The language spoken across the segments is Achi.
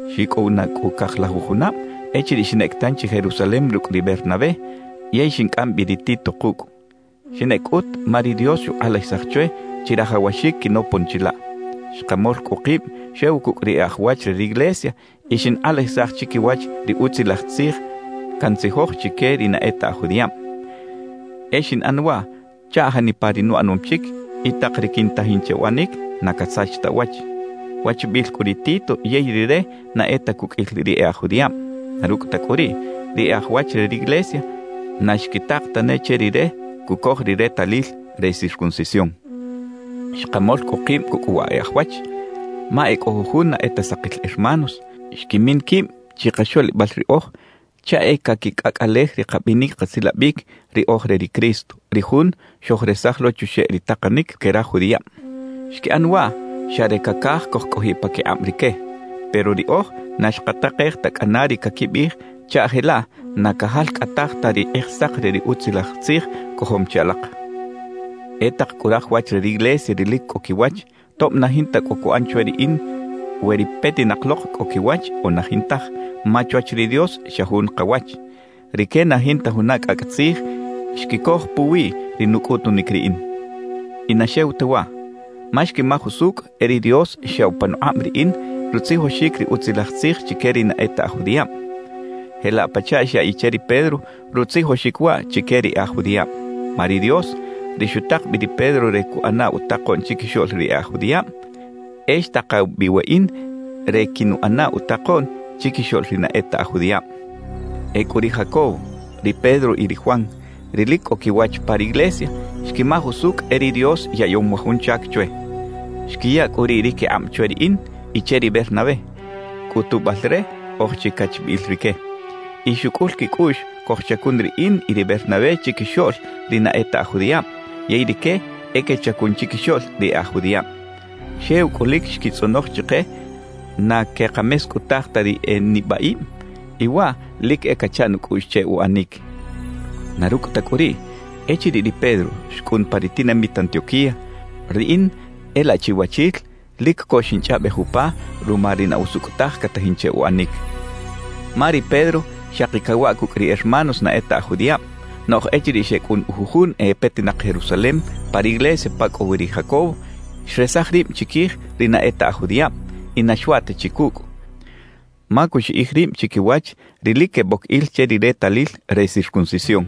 Xicꞌow na cꞌu cajlajuj junab echiriꞌ xinꞌec tanchi Jerusalem rucꞌ ri Bernabé, yey xincꞌam bi ri Tito kucꞌ. Xinꞌec cꞌut, ma ri Dios xukꞌalajisaj chwe chirajawaxic quinopon chilaꞌ. Xkamol cꞌu kib xew cucꞌ ri e aj wach re riglesia y xinkꞌalajisaj chiquiwach ri Utzilaj Tzij cantzijoj chique ri na e ta aj judiꞌab. E xinꞌan waꞌ chaꞌ janipa ri nuꞌanom chic y tak ri quintajin che uꞌanic na casach ta uwach. Wachbiꞌil cꞌu ri Tito yey rire na e ta cuqꞌuil ri e aj judiꞌab; na rucꞌ ta cꞌu riꞌ, ri e aj wach re riglesia na xquitak tane che rire cucoj ri retalil re circuncisión. Xkamol cꞌu kib cucꞌ wa e aj wach, ma e cꞌo jujun na e ta sakil hermanos xquimin quib chikaxoꞌlibal riꞌoj chaꞌ e caquicꞌacꞌalej ri kabinic kasilabic ri oj re ri Cristo, ri Jun xojresaj lo chuxeꞌ ri takanic que raj judiꞌab. Xquiꞌan waꞌ xa re cacaj cojcꞌojiꞌ paquikꞌab rique. Pero riꞌoj na xkatakej ta cꞌana ri caquibiꞌij chaꞌ jelaꞌ na cajalcꞌataj ta ri Kꞌijsak re ri Utzilaj Tzij cojom chi alak. E tak cꞌu raj wach re riglesia ri lic cꞌo quiwach, tob na jinta cꞌo cuꞌan chwe riꞌin we ri petinak lok cꞌo quiwach o na jintaj ma chwach ri Dios xa jun kawach; rique na jinta juna cꞌacꞌ tzij xquicoj puwi ri nucꞌutunic riꞌin. Y na xew ta waꞌ, ma xquimaj usucꞌ e ri Dios xyaꞌw panukꞌab riꞌin rutzijoxic ri Utzilaj Tzij chique ri na e ta aj judiꞌab, jelaꞌ pachaꞌ xyaꞌiꞌ che ri Pedro rutzijoxic waꞌ chique ri e aj judiꞌab. Ma ri Dios, ri xutak bi ri Pedro re cuꞌana utakoꞌn chiquixoꞌl ri e aj judiꞌab, e xtakaw bi weꞌin re quinuꞌana utakoꞌn chiquixoꞌl ri na e ta aj judiꞌab. Ecꞌu ri Jacobo, ri Pedro y ri Juan, ri lic cꞌo quiwach pa riglesia, xquimaj usucꞌ e ri Dios yaꞌyom wa jun chac chwe. Xquiya cꞌu riꞌ ri quikꞌab chwe riꞌin y che ri Bernabé, cꞌutubal re oj chi cachbiꞌil rique. Y xucꞌul quicꞌuꞌx cojchacun riꞌin y ri Bernabé chiquixoꞌl ri na e ta aj judiꞌab, yey rique e quechacun chiquixoꞌl ri e aj judiꞌab. Xew cꞌu lic xquitzꞌonoj chike na quekamescꞌutaj ta ri e nibaꞌib y waꞌ lic e cacha nucꞌuꞌx che uꞌanic. Na rucꞌ ta cꞌu riꞌ, echiriꞌ ri Pedro xcꞌun pa ri tinamit Antioquía, riꞌin e laꞌ chiwachil lic co xinchꞌaꞌbej upa ruma ri na usucꞌ taj catajin che uꞌanic. Ma ri Pedro xaki cawaꞌ cucꞌ ri hermanos na e ta aj judiꞌab, noꞌj echiriꞌ xecꞌun jujun e petinak Jerusalem pa riglesia pa cꞌo wi ri Jacobo, xresaj rib chiquij ri na e ta aj judiꞌab y na xwaꞌ ta chi cucꞌ, ma cuxiꞌij rib chiquiwach ri lic queboc il che ri retalil re circuncisión.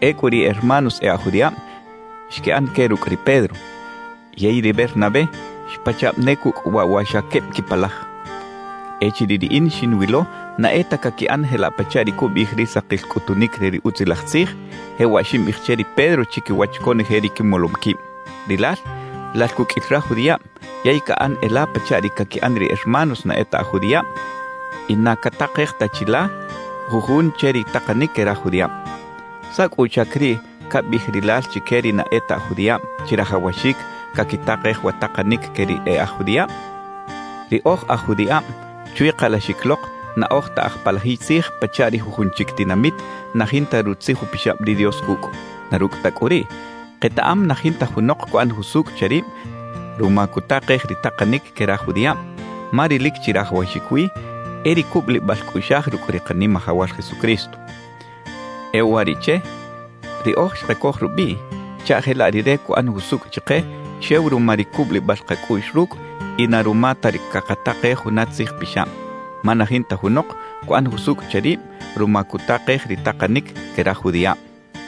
Ecꞌu ri hermanos e aj judiꞌab xquiꞌan que rucꞌ ri Pedro, yey ri Bernabé xpachaꞌb ne cucꞌ waꞌ wa xa queb quipalaj. Echiriꞌ riꞌin xinwilo na e ta caquiꞌan jelaꞌ pachaꞌ ri cubiꞌij ri sakil cꞌutunic re ri Utzilaj Tzij, jewaꞌ ximbiꞌij che ri Pedro chiquiwach conoje ri quimolom quib: «Rilal, lal cuqꞌuil raj judiꞌab yey caꞌan e la pachaꞌ ri caquiꞌan ri hermanos na e ta aj judiꞌab y na catakej ta chi la jujun che ri takanic que raj judiꞌab. ¿Saꞌ cꞌu uchac riꞌ cabiꞌij rilal chique ri na e ta aj judiꞌab chirajawaxic caquitakej wa takanic que ri e aj judiꞌab?» Ri oj aj judiꞌab, chwi kalaxic lok, na oj ta aj palajiy tzij pachaꞌ ri jujun chic tinamit na jinta Rutzij Upixab ri Dios cucꞌ. Na rucꞌ ta cꞌu riꞌ, ketaꞌam na jinta junok cuꞌan jusucꞌ che rib ruma cutakej ri takanic que raj judiꞌab; ma ri lic chirajawaxic wi e ri cubulibal cꞌuꞌxaj rucꞌ ri Kanimajawal Jesucristo. E uwariꞌche riꞌoj xkacoj rubiꞌ chaꞌ jelaꞌ Rire cuꞌan jusucꞌ chike xew ruma ri cubulibal kacꞌuꞌx rucꞌ y na ruma ta ri cakatakej juna tzij pixab. Ma na jinta junok cuꞌan jusucꞌ che rib ruma cutakej ri takanic que raj judiꞌab.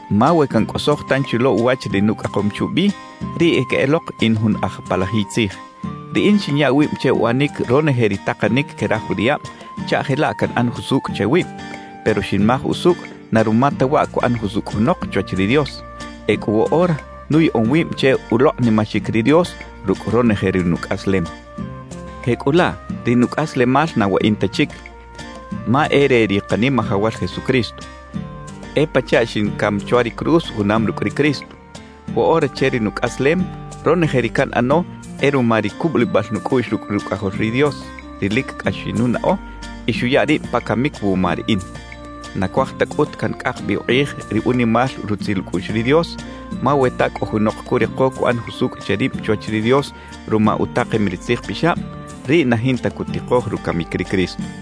Ma we cancꞌosoj tanchi lo uwach ri nucꞌakom chubi, riꞌ e queꞌelok in jun aj palajiy tzij. Riꞌin xinya wib che uꞌanic ronoje ri takanic que raj judiꞌab chaꞌ jelaꞌ canꞌan jusucꞌ che wib, pero xinmaj usucꞌ na ruma ta waꞌ cuꞌan jusucꞌ junok chwach ri Dios; ecꞌu woꞌora nuyaꞌom wib che ulokꞌnimaxic ri Dios rucꞌ ronoje ri nucꞌaslem. Jecꞌulaꞌ, ri nucꞌaslemal na weꞌin ta chic, ma e re ri Kanimajawal Jesucristo. E pachaꞌ xincam chwa ri cruz junam rucꞌ ri Cristo. Woꞌora che ri nucꞌaslem, ronoje ri canꞌano e ruma ri cubulibal nucꞌuꞌx rucꞌ Rucꞌajol ri Dios, ri lic cꞌax xinunaꞌo y xuya rib pa camic wuma riꞌin. Na cuaj ta cꞌut cancꞌak bi ukꞌij ri unimal rutzil ucꞌuꞌx ri Dios; ma we ta cꞌo junok curiko cuꞌan jusucꞌ che rib chwach ri Dios ruma utakem ri tzij pixab, riꞌ na jinta cutikoj rucamic ri Cristo.